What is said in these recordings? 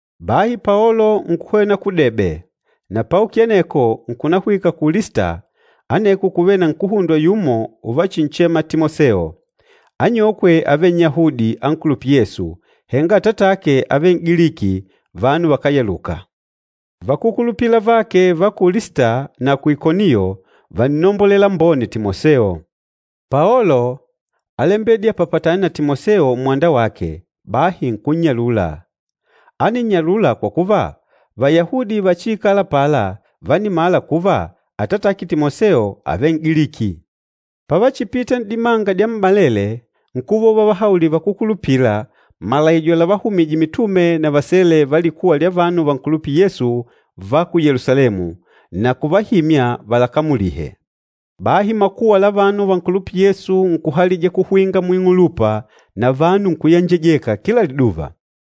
Bahi Paolo nkuhwena ku Debe, na paukile aneko nkunahwika ku Lista aneko kúvele nkuhundwa yumo uvachinchema Timoseo. Anyokwe ávele Nnyahudi ankulupîla Yesu, henga atatake ávele N'giliki, vanu vakáyaluka. Vakúkulupila avake va ku Lista na ku Ikoniyo vánnombolela lambone Timoseo. Paolo álembedile apapatane na Timoseo mmwanda wake, bahi nkunnyalula. Áninnyalula kwa kuva, Vayahudi vachiikâla apala vánimala kuva atatake Timoseo ávele N'giliki. Pavachipita n'dimanga dyammalele nkuva uvavahaulila vakúkulupila malaijo lavahumije mitume na vasele va likuwa lya vanu vankulupîla Yesu va ku Yelusalemu, na kuvahimya valakamulihe. Bahi makuwa la vanu vankulupîla Yesu nkuhalija kuhwinga muing'ulupa na vanu nkuyenjejeka kila liduva.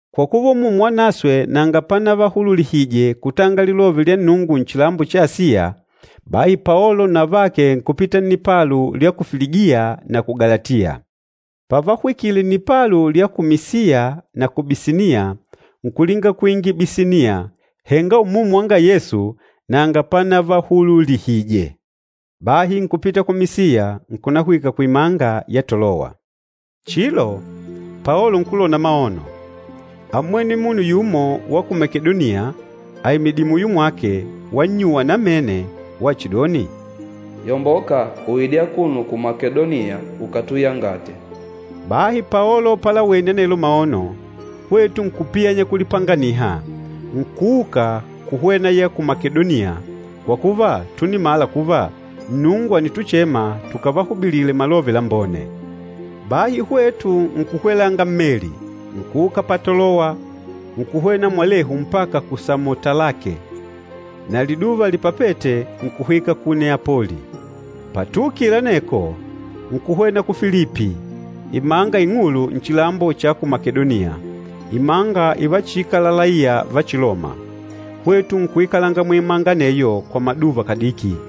Kwa kuva Umumu Wanaswe nanga panavahululihije kutanga Lilove lya Nnungu nchilambo cha Asiya, bahi Paolo na avake nkupita nnipalu lya ku Filigiya na ku Galatiya. Pavahwikile nnipalu lya ku Misiya na ku Bisiniya, nkulinga kuingila ku Bisiniya, henga Umumu wanga Yesu nanga panavahululihije. Bahi nkupita ku Misiya nkunahwika kuimanga ya Tolowa. Chilo, Paolo nkulona maono, ámmwene munu yumo wa ku Makedoniya aimidìlè muyo mwake wannyuwa namene wachidoni, “Yomboka uide akuno ku Makedoniya ukatuyangate.” Bahi Paolo palawene anelo maono, hwetu nkupiyanya kulipanganiha, nkuuka kuhwena ya ku Makedoniya, kwa kuva túnimala kuva Nnungu ànituchema tukavahubilile Malove Lambone. Bahi hwetu nkukwelanga mmeli, nkuuka pa Tolowa, nkuhwena mwalehu mpaka ku Samotalake, na liduva lipapête nkuhwika ku Neapoli. Patuukile aneko, nkuhwena ku Filipi, imanga ing'ulu nchilambo cha ku Makedoniya, imanga ivachiikala laiya va Chiloma. Hwetu nkuikalanga muimanga aneyo kwa maduva kadiki.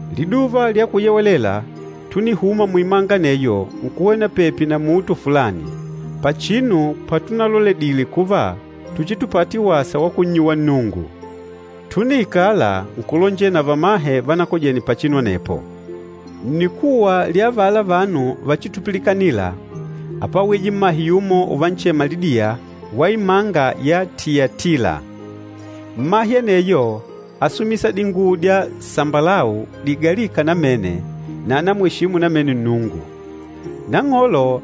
Liduva lya Kuyewelela túnihuma muimanga aneyo nkuhwena pepi na muto fulani, pachinu patunaloledile kuva tuchitupate wasa wa kunnyuwa Nnungu. Túniikala, nkulonjela na vamahe vanakojene pachinu anepo. Nnikuwa lya avala vanu vachitupilikanila, ápwawije mmahe yumo uvanchema Lidiya wa imanga ya Tiyatila. Mmahe aneyo ásumisa dinguwo dya sambalau digalîka namene na ánamweshimu namene Nnungu. Nang'olo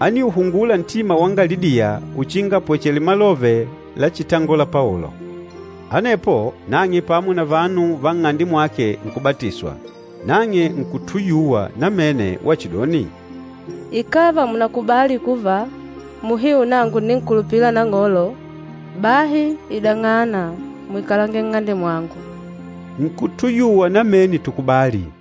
ániuhungula ntima wanga Lidiya uchinga apwechele malove lachitangola Paolo. Anepo nang'e pamo na vanu va nng'ande mwake nkubatiswa. Nang'e nkutuyuwa namene wachidoni, “Ikàva mùnakubali kuva, muhiu nangu ǹninkulupila Nang'olo, bahi idang'ana muikalange nng'ande mwangu.” Nkutuyuwa namene tukubali.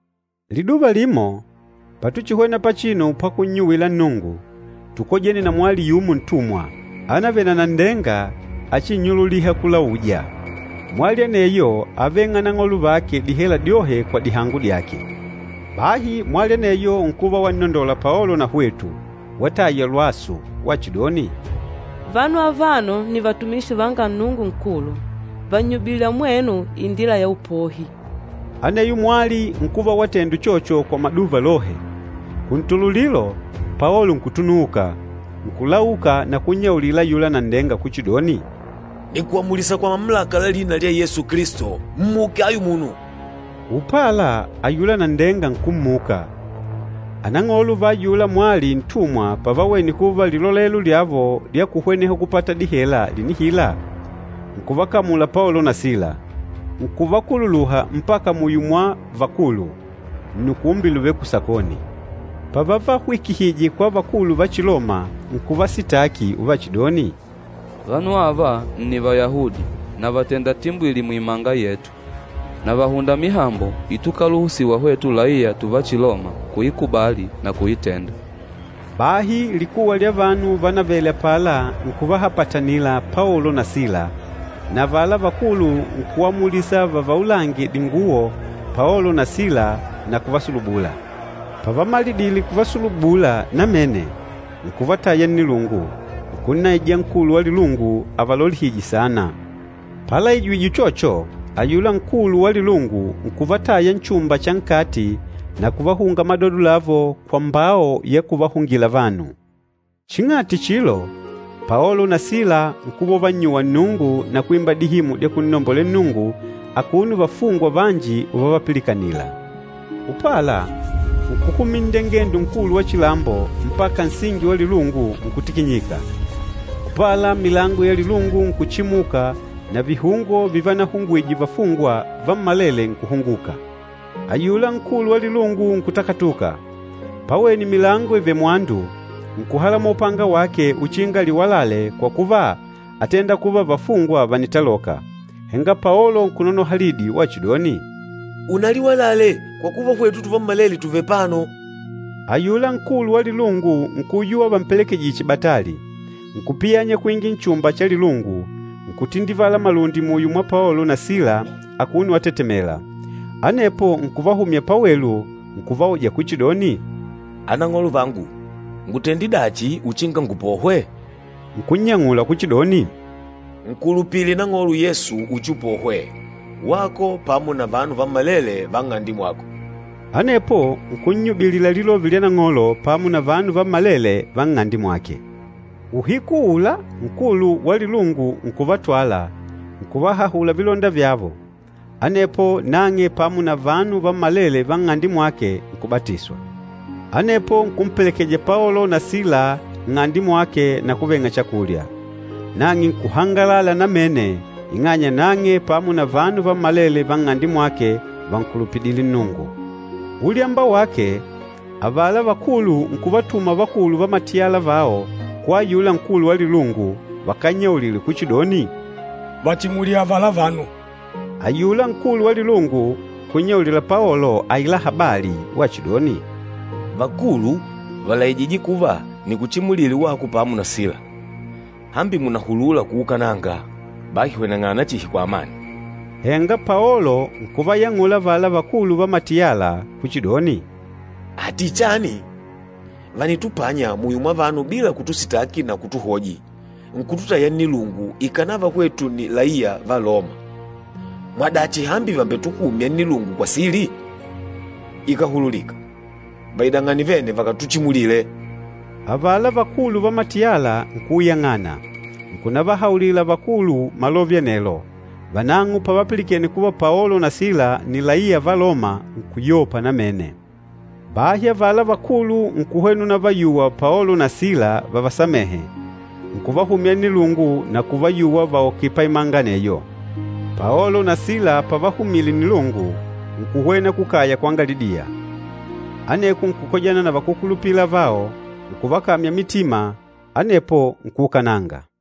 Liduva limo, patuchihwena pachinu pakunnyuwila Nnungu, tukojene na mwali yumo ntumwa, anavele na nanndenga achinnyululiha kulauja. Mwali aneyo áveng'a anang'olo vake dihela dyohe kwa dihango dyake. Bahi mwali aneyo nkuva wannondola Paolo na hwetu, wataya lwasu wachidoni, “Vanu avano nni vatumishi vanga Nnungu Nkulu. Vànnyubilila mwenu indila ya upohi.” Aneyo mwali nkuva watenda uchocho kwa maduva lohe. Kuntululilo, Paolo nkutunuuka, nkulauka na kunnyaulila ayula nanndenga kuchidoni, “Nìkuamulisa kwa mamulaka la lina lya Yesu Kilisto, mmuke ayuno munu!” Upala ayula nanndenga nkummuka. Anang'olo va ayula mwali ntumwa pavawene kuva lilolelo lyavo lya kuhweneha kupata dihela lìnihila, nkuvakamula Paolo na Sila, nkuvakululuha mpaka muyo mwa vakulu, nnukumbi luvêle kusakoni. Pavavahwikihije kwa vakulu va Chiloma, nkuvasitaki uvachidoni, “Vanu ava nni Vayahudi na vàtenda timbwili muimanga yetu. Na vàhunda mihambo itukaluhusiwa hwetu laiya tuva Chiloma kuikubali na kuitenda.” Bahi likuwa lya vanu vanavele apala nkuvahapatanila Paolo na Sila, na avala vakulu nkuamulisa vavaulange dinguwo Paolo na Sila na kuvasulubula. Pavamalidile kuvasulubula namene nkuvataya nnilungu, nkunnaija nkulu wa lilungu avalolihije saana. Palaijijwe uchocho, ayula nkulu wa lilungu nkuvataya nchumba cha nkati na kuvahunga madodo lavo kwa mbao ya kuvahungila vanu. Ching'ati chilo, Paolo na Sila nkuva uvannyuwa Nnungu na kwimba dihimu dya kunnombolela Nnungu akuno vafungwa vanji uvavapilikanila. Upala, nkuhumila nndengendo nkulu wa chilambo mpaka nsingi wa lilungu nkutikinyika. Upala, milango ya lilungu nkuchimuka na vihungo vivanahungwije vafungwa vammalele nkuhunguka. Ayula nkulu wa lilungu nkutakatuka, pawene milango ivèlè mwandu, nkuhalamola upanga wake uchinga aliwalale kwa kuva átenda kuva vafungwa vànitaloka. Henga Paolo nkunonoha lidi wachidoni, “Unaliwalale kwa kuva hwetu tuvammalele tùvele apano!” Ayula nkulu wa lilungu nkuyuwa vampelekejije chibatali, nkupiyanya kuingila nchumba cha lilungu, nkutindivala malundi muyo mwa Paolo na Sila akuno watetemela. Anepo nkuvahumya pawelu, nkuvauja kuchidoni, “Anang'olo vangu, ngutende dachi uchinga ngupohwe?” Nkunnyang'ula kuchidoni, “Nkulupile Nang'olo Yesu uchiupohwe, wako pamo na vanu vammalele va nng'ande mwako.” Anepo nkunnyubilila Lilove lya Nang'olo pamo na vanu vammalele va nng'ande mwake. Uhiku uula nkulu wa lilungu nkuvatwala, nkuvahahula vilonda vyavo, anepo nang'e pamo na vanu vammalele va nng'ande mwake nkubatiswa. Anepo nkumpelekeja Paolo na Sila nng'ande mwake na kuveng'a chakulya. Nang'e nkuhangalala namene ing'anya nang'e pamo na vanu vammalele va nng'ande mwake vankulupidile Nnungu. Ulyamba wake, avala vakulu nkuvatuma vakulu va matiyala vao kwa ayula nkulu wa lilungu vakannyaulile kuchidoni, “Vachimulile avala vanu.” Ayula nkulu wa lilungu nkunnyaulila Paolo aila habali wachidoni, “Vakulu vàlaijije kuva nikuchimulile wako pamo na Sila. Hambi mùnahulula kuukananga. Bahi hweneng'ana chihi kwa amani.” Henga Paolo nkuvayang'ula avala vakulu va matiyala kuchidoni, “Ati chani? Vànitupanya muyo mwa vanu bila kutusitaki na kutuhoji, nkututaya nnilungu ikànava hwetu nni laiya va Loma. Mwadachi hambi vàmbetuhumya nnilungu kwa sili? Ikáhululika! Vaidang'ane vene vakatuchimulile!” Avala vakulu va matiyala nkuuyang'ana, nkunavahaulila vakulu malove anelo. Vanang'o pavapilikene kuva Paolo na Sila nni laiya va Loma nkuyopa namene. Bahi avala vakulu nkuhwena unavayuwa Paolo na Sila vavasamehe, nkuvahumya nnilungu na kuvayuwa vauke paimanga aneyo. Paolo na Sila pavahumile nnilungu, nkuhwena kukaya kwanga Lidiya. Aneko nkukojana na vakúkulupila avao, nkuvakamya mitima, anepo nkuukananga.